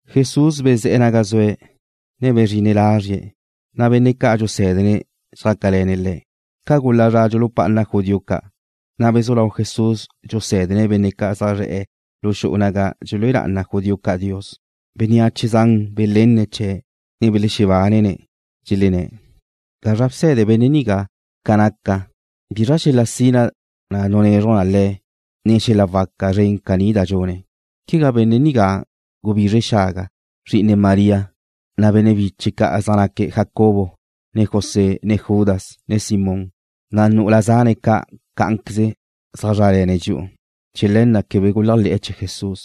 Jesús bezé̱'e̱ naga zue̱', ne bezrine̱' lazrie̱', na' benne' ca' dxusé̱dene̱' xjácale̱ne̱' Le̱'. Ca gula zra dxulupá'ana judío ca', na' bezú lau Jesús dxusé̱dene̱' benne' ca' zaj zre̱'e̱ lu xu'u naga dxelúe lá'ana judío ca' Dios. Bénneache zan belenne̱' chee̱', ne belexebánene̱', dxelenné̱': ―¿Gazra bse̱de benne' nigá ca nácate̱? ¿Bizra xel-la sina da nunezruj Le̱', ne xel-la waca zren caní da dxune̱'? ¿Quegá benne' nigá gubizre xaga, zri'ine María, na' benne' biche̱' ca' zaj naque̱' Jacobo, ne José, ne Judas, ne Simón, na' nu'ula zane̱' ca' cá'anqueze zaj zrále̱ne̱' dxi'u? Chee̱ le̱ na' quebe guléajle̱'e̱ chee̱ Jesús.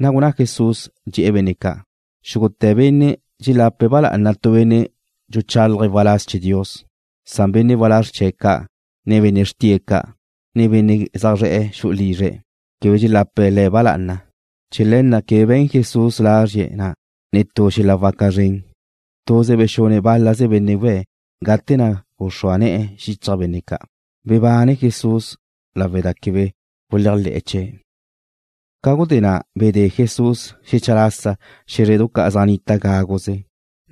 Na' gunná Jesús, dxe̱'e̱ benne' ca': ―Xúgute̱ benne' dxelape̱' ba lá'ana tu benne' dxuchálaje̱' waláz chee̱ Dios, san benne' walázr chee̱' ca', ne benne' xrtie̱' ca', ne benne' zaj zre̱'e̱ xu'u lizre̱' quebe dxelape̱' le̱' ba lá'ana. Chee̱ le̱ na' quebe be̱n Jesús lazrie̱' na' netú xel-la waca zren. Tuze bexune̱' bál-laze benne' we̱' gate na' guxrúa ne̱'e̱ xichaj benne' ca'. Bebane Jesús lawe' da quebe guléajle̱'e̱ chee̱'. Ca gudé na' bedé Jesús xecha lasa xé̱zredu ca' zaj nnita gáguze,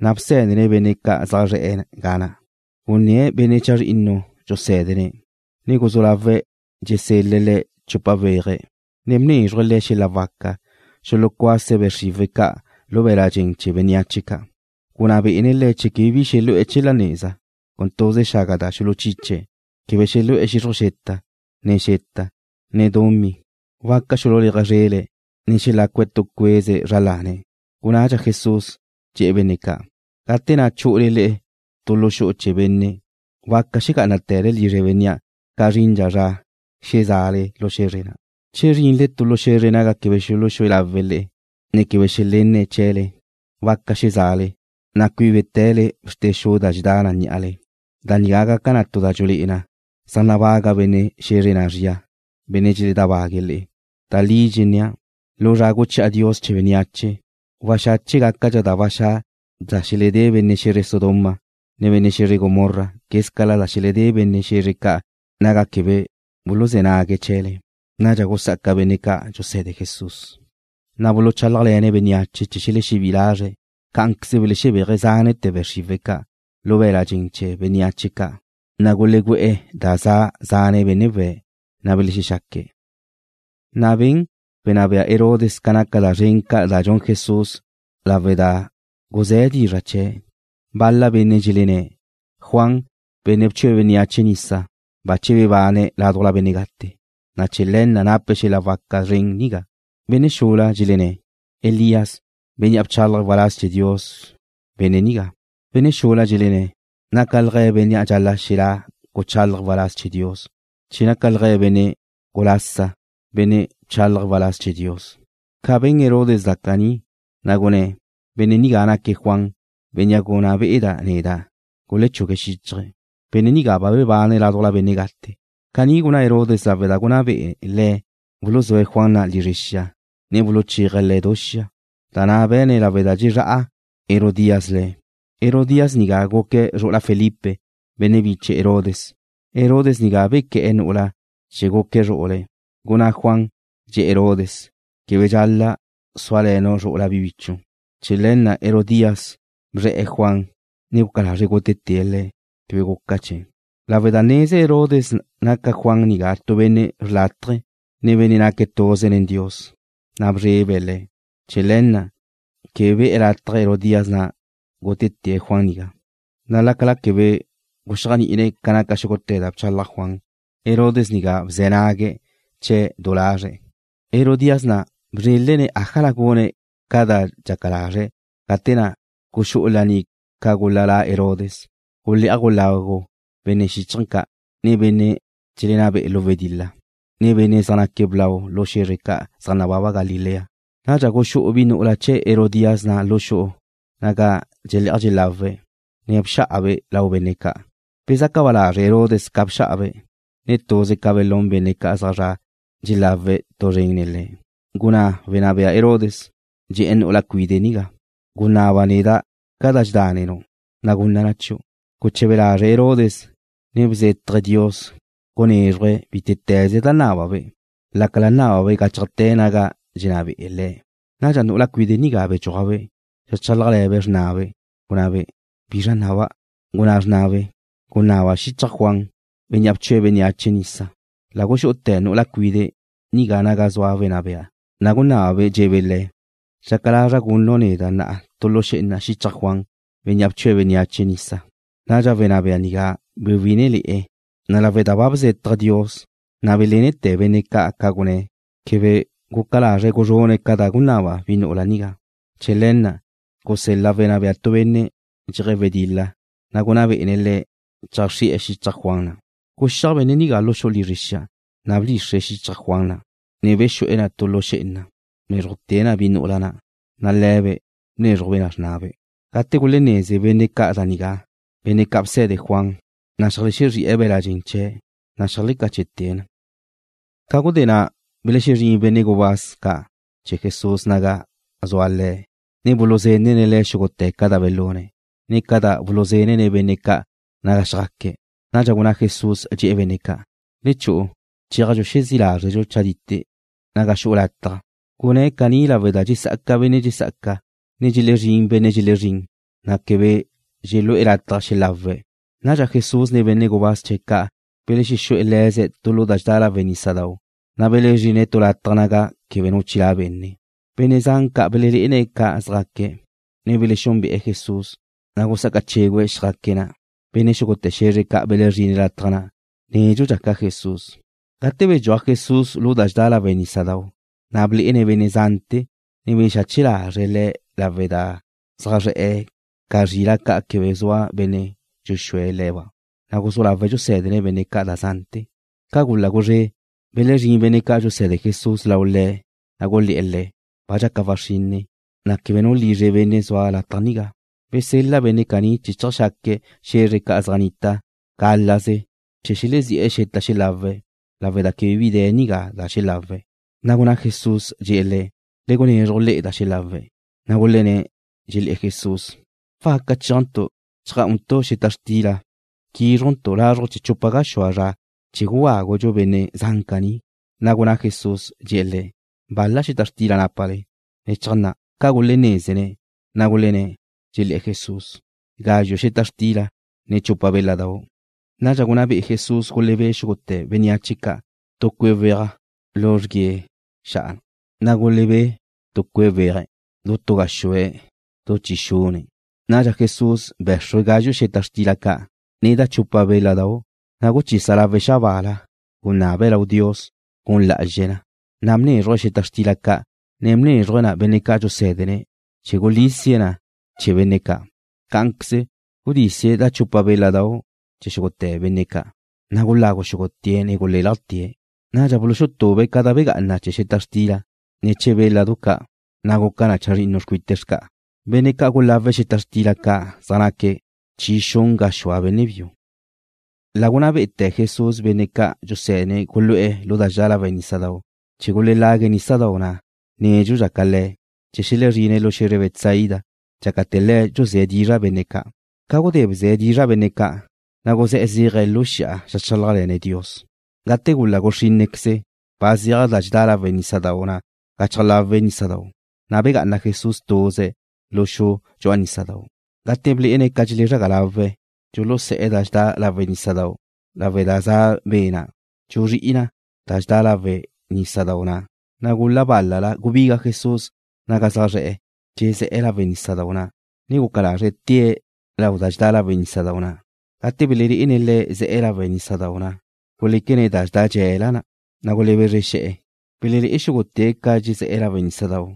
na' bsé̱dene̱' benne' zaj zre̱'e̱ ga na'. Gunné̱' benne' chazrinnu dxusé̱dene̱', ne guzú lawe̱' dxesel-le̱' le̱' chupa weaje̱', ne bnézruje̱' le̱' xel-la waca xulucuase̱' be' xriwe̱' ca' lu be̱l-la' dxen chee̱ bénneache ca'. Gunná bé'ene̱' le̱' quebe bi xelu'e̱ chee̱ la neza, con tuze xaga da xuluchiche̱'. Quebe xelu'e̱ xixruj xeta, ne xeta, ne dumí. Waca xululéaje̱' zrele̱', ne xelácue̱' tu cueze zra lane̱'. Gunnadxa Jesús, dxe̱'e̱ benne' ca': ―Gate na' chu'ule le'e tu lu xu'u chee̱ benne', waca xegá'anate̱le lizre bénnea' ca zrindxa zra xezá'ale lu xe̱zre na'. Che zrinle tu lu xe̱zre naga quebe xuluxé lawe̱' le'e, ne quebe xelénene̱' chee̱le, waca xezá'ale, na' cuíbete̱le bxrte xu da dxedá' ní'ale. Da nigá gaca na tu da dxulé'e na zaj nabaga benne' xe̱zre na' zria, benne' dxeledábaga' le'e. Da li dxennéa', lu zra guchi'a Dios chee̱ bénneache, waxache' gácadxa da ba xa' da xeledé benne' xe̱zre Sodoma, ne benne' xe̱zre Gomorra quézcala da xeledé benne' xe̱zre ca' naga quebe buluzé̱ nague̱' chee̱le. Nadxa gusá'aca benne' ca' dxuse̱de Jesús, na' buluchálajle̱ne̱' bénneache chee̱ xelexebí'i lazre̱'. Cá'anqueze belexebéaje̱' zánete̱ be' xriwe̱' ca' lu be̱l-la' dxen chee̱ bénneache ca', na' gulegüe̱'e̱ da za zane' benne' we̱', na' belexexaque̱'. Na' ben wenná bea Herodes ca naca da zren ca' da dxun Jesús lawe' da guzé̱ dizra' chee̱'. Bal-la benne' dxelenné̱': ―Juan, benne' bchue̱' bénneache nisa, bache bebane̱' ládujla benne' gate, na' chee̱ le̱ na' nape̱' xel-la waca zren nigá. Benne' xula dxelenné̱': ―Elías, bénnea' bchálaje̱' waláz chee̱ Dios benne' nigá. Benne' xula dxelenné̱': ―Nácalje̱' bénnea' dxal-la' xelá' guchálaje̱' waláz chee̱ Dios, che nácalje̱' benne' gulasa, benne' bchálaje̱' waláz chee̱ Dios. Ca ben Herodes da caní, na' gunné̱': ―Benne' nigá naque̱' Juan, bénnea' gunná be'eda' neda' gulechugue̱' xíchaje̱'. Benne' nigá ba bebane̱' ládujla benne' gate. Caní gunná Herodes lawe' da gunná be'e le̱' buluzúe̱' Juan na' lizre xia, ne buluchéaje̱' le̱' du xia, da na' be̱ne̱' lawe' da dxezrá'a Herodías le̱'. Herodías nigá guque̱' zru'ula Felipe, benne' biche Herodes. Herodes nigá bequé̱'e̱ nu'ula' chee̱ guque̱' zru'ule̱'. Gunná Juan, dxe̱'e̱ Herodes: ―Quebe dxal-la' súale̱nu' zru'ula bi bichu'. Chee̱ le̱ na' Herodías guzré̱'e̱ Juan, ne guca lazre̱' gútete̱' le̱'. Quebe guca chee̱' lawe' da neze Herodes naca Juan nigá tu benne' xrlátaje, ne benne' naque̱' tuze nen Dios, na' bezrebe̱' le̱'. Chee̱ le̱ na' quebe be̱'e̱ lataj Herodías na' gútete̱' Juan nigá, na' lácala quebe guxéajni'ine̱' ca naca xúgute̱ da bchalaj Juan, Herodes nigá bze̱ nague̱' chee̱' du lazre̱'. Herodías na' bzrélene̱' ájala gune̱' ca da dxaca lazre̱' gate na' guxú'u laní ca gula la Herodes. Gulé'aj gulagu benne' xíchaje̱ ca', ne benne' dxelenná be'e̱ lu wedil-la, ne benne' zaj naque̱' blau lu xe̱zre ca' zaj nababa Galilea. Nadxa guxú'u bi nu'ula chee̱ Herodías na' lu xu'u naga dxelé'aj dxelawe̱', ne bxá'abe' lau benne' ca'. Bezaca ba lazre' Herodes ca bxá'abe', ne tuze ca belún benne' ca' zaj zra' dxelawe̱' tu zren nen le̱'. Gunná wenná bea Herodes, dxe̱'e̱ nu'ula cuide' nigá: ―Gunaba neda' ca da dxedánenu', na' gunna' na chiu'. Guche̱be lazre' Herodes, ne bzétaje̱' Dios gunézruje̱' bítete̱ze da nábabe', lácala nábabe' gáchajte̱ naga dxenná be'e̱ le̱'. Nadxa nu'ula cuide' nigá bdxúajbe', xeajchálajle̱be' xrnabe', gunabe': ―¿Bizra naba'? Gunná xrnabe': ―Gunaba xichaj Juan, bénnea' bchue̱' bénneache nisa. La guxu'ute̱ nu'ula cuide' nigá naga zua wenná bea, na' gunabe', dxe̱'e̱be' le̱': ―Dxaca lazra' gunnu' neda' na'a tu lu xé'ena xichaj Juan, bénnea' bchue̱' bénneache nisa. Nadxa wenná bea nigá bewí'inele̱'e̱, ne lawe' da ba bzétaje̱' Dios, na' belénete̱ benne' ca' da gunné̱', quebe guca lazre̱' guzrune̱' ca da gunaba bi nu'ula nigá. Chee̱ le̱ na' gusel-la wenná bea tu benne' dxeje̱' wedil-la, ne gunná bé'ene̱' le̱' cheajxrí'e̱ xichaj Juan na'. Guxíaj benne' nigá lu xu'u lizre xia, na' bdxixre̱' xichaj Juan na', ne bexu'e̱ na tu lu xé'ena. Bnézrujte̱' na bi nu'ula na', na' le̱be' bnézrujbe' na xrnabe'. Gate gulénneze benne' ca' da nigá, benne' ca' bse̱de Juan, na' xeajlexexrí'e̱ be̱l-la' dxen chee̱', na' xeajlecáchete̱' na. Ca gudé na' belexezrín benne' gubáz ca' chee̱ Jesús naga zua Le̱', ne buluzenne̱' Le̱' xúgute̱ ca da belune̱', ne ca da bulusé̱dene̱' benne' ca' naga xjaque̱'. Nadxa gunná Jesús, dxe̱'e̱ benne' ca': ―Le chu'u. Chéajdxu xezí' lázredxu chadite' naga xu'u lataj. Gunné̱' caní lawe' da dxesá'aca benne' dxesá'aca, ne dxelexezrín benne' dxelexezrín, na' quebe dxelu'e̱ lataj xelawe̱'. Nadxa Jesús ne benne' gubáz chee̱' ca' belexexú'e̱ le̱ze̱' tu lu da dxedá lawe' nísadau', na' belezrine̱' tu lataj naga quebe nu chilá' benne'. Benne' zan ca' belelé'ene̱' ca zjaque̱', ne belexexúnbe'e̱ Jesús, na' gusá'aca chégüe̱' xjá'aque̱' na'. Benne' xúgute̱ xe̱zre ca' belezrine̱' lataj na' nédxudxa ca Jesús. Gate bedxúaj Jesús lu da dxedá lawe' nísadau', na' blé'ene̱' benne' zante̱, ne bexache lazre̱' le̱' lawe' da zaj zre̱'e̱ ca zrila' ca' quebe zua benne' dxuxúe̱' le̱ba'. Na' guzú lawe̱' dxusé̱dene̱' benne' ca' da zante̱. Ca gula guzré', belezrín benne' ca' dxuse̱de Jesús lau Le̱', na' gulé̱'e̱ Le̱': ―Ba dxaca waxrinne, na' quegá nu lizre benne' zua lataj nigá. Besel-la benne' caní chee̱ cheajxaque̱' xe̱zre ca' zaj nnita gálaze chee̱ xelezí'e̱ xeta xelawe̱' lawe' da quebe bi de̱ nigá da xelawe̱'. Na' gunná Jesús, dxe̱'e̱ le̱': ―Le gunezruj le'e da xelawe̱'. Na' gulenné̱', dxelé̱'e̱ Jesús: ―¿Waca chéajntu' cheajgá'untu' xeta xtila, quízrujntu' lazruj chee̱ chupa gaxúa zra chee̱ gugágudxu benne' zan caní? Na' gunná Jesús, dxe̱'e̱ le̱': ―¿Bal-la xeta xtila nápale? Le cheajnná'. Ca gulenézene̱', na' gulenné̱', dxelé̱'e̱ Jesús: ―Gazxu' xeta xtila, ne chupa béladau'. Nadxa gunná be'e Jesús gulebé'e xúgute̱ bénneache ca' tu cue' weaj lu xrguíe xa'a. Na' gulebé'e̱ tu cue' weaj, du tu gaxúe̱', du chi xune̱'. Nadxa Jesús bé̱xrue̱' gazxu' xeta xtila ca', ne da chupa béladau'. Na' guchisa lawe̱' xabaala, gunabe̱' lau Dios gun la'azxe̱' na, na' bzúzruje̱' xeta xtila ca', ne bnézruje̱' na benne' ca' dxusé̱dene̱' chee̱ gulísie̱' na chee̱ benne' ca'. Cá'anqueze gudísie̱' da chupa béladau' chee̱ xúgute̱ benne' ca'. Na' gulagu xúgute̱' ne gulélajte̱'. Nadxa buluxutube̱' ca da begá'ana chee̱ xeta xtila, ne chee̱ béladu ca', na' guca chazrinnu xcuite xca'a. Benne' ca' gulawe̱' xeta xtila ca' zaj naque̱' chi xun gaxúa benne' biu. La gunná bé'ete̱ Jesús benne' ca' dxusé̱dene̱' gulu'e̱ lu da dxedá lawe' nísadau' chee̱ gulelague̱' nísadau' na' nédxudxa ca Le̱', chee̱ xelexezrine̱' lu xe̱zre Betsaida dxácate̱ Le̱' dxuzé̱' dizra' bénne' ca'. Ca gudé bze̱' dizra' benne' ca', na' guzé̱'e̱ zéaje̱' lu xi'a zeajchálajle̱ne̱' Dios. Gate gula guxrínnequeze, ba zeaj da dxedá lawe' nísadau' na' gachaj lawe' nísadau', na' begá'ana Jesús tuze̱' lu xu dxu'a nísadau'. Gate blé'ene̱' ca dxelezraga lawe̱' dxulusé̱'e̱ da dxedá lawe' nísadau' lawe' da za be' na', dxuzrí'i na da dxedá lawe' nísadau' na', na' gula balá' gubiga Jesús naga zaj zre̱'e̱, dxezé̱'e̱ lawe' nísadau' na', ne guca lazre̱' tée̱' lau da dxedá lawe' nísadau' na'. Gate belelé'ene̱' Le̱' ze̱'e̱ lawe' nísadau' na', guléquene̱' da dxedá dxe̱la, na' gulebezre xe̱'e̱. Belelé'e xúgute̱' ca dxezé̱'e̱ lawe' nísadau',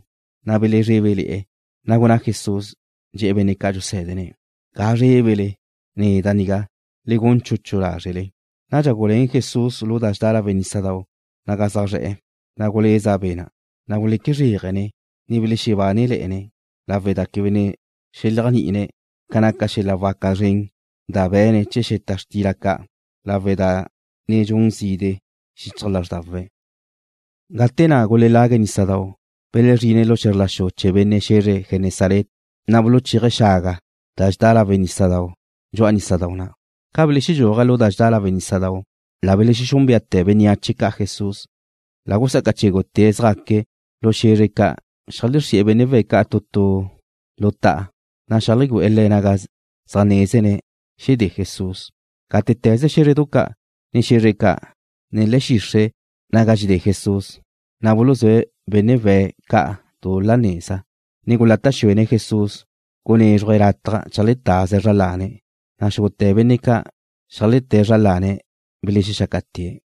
na' belezrébele̱'e̱. Na' gunná Jesús, dxe̱'e̱ benne' ca' dxusé̱dene̱': ―Ga zrébele. Neda' nigá. Le gun chuchu lázrele. Nadxa guluén Jesús lu da dxedá lawe' nísadau' naga zaj zre̱'e̱, na' guleza be' na'. Na' guleque zréajene̱', ne belexebánele̱'e̱ne̱', lawe' da quebe ne xeléajni'ine̱' ca naca xel-la waca zren da be̱ne̱' chee̱ xeta xtila ca', lawe' da ne dxun zide' xichaj lázrdawe̱'. Gate na' gulelague̱' nísadau', belezrine̱' lu xe̱zr la xu chee̱ benne' xe̱zre Genesaret, na' buluchéaje̱' xaga da dxedá lawe' nísadau' dxu'a nísadau' na'. Ca beledxúaje̱' lu da dxedá lawe' nísadau', la belexexúnbeate̱ bénneache ca' Jesús. La gusá'aca chégute̱' zjaque̱' lu xe̱zre ca' xeajlexrí'e̱ benne' we̱' ca' tu tu lu ta'a, na' zeajlegüé̱'e̱ le̱' naga zaj nézene̱' xedé Jesús. Gátete̱ze xé̱zredu ca', ne xe̱zre ca', ne le̱'e̱ xixre' naga dxedé Jesús, na' buluzúe̱' benne' we̱' ca' du la neza, ne gulata' xuene̱' Jesús gunézruje̱' lataj cheajletaze̱' zra lane̱', na' xúgute̱ benne' ca' xeajleté̱' zra lane̱' belexexácate̱'.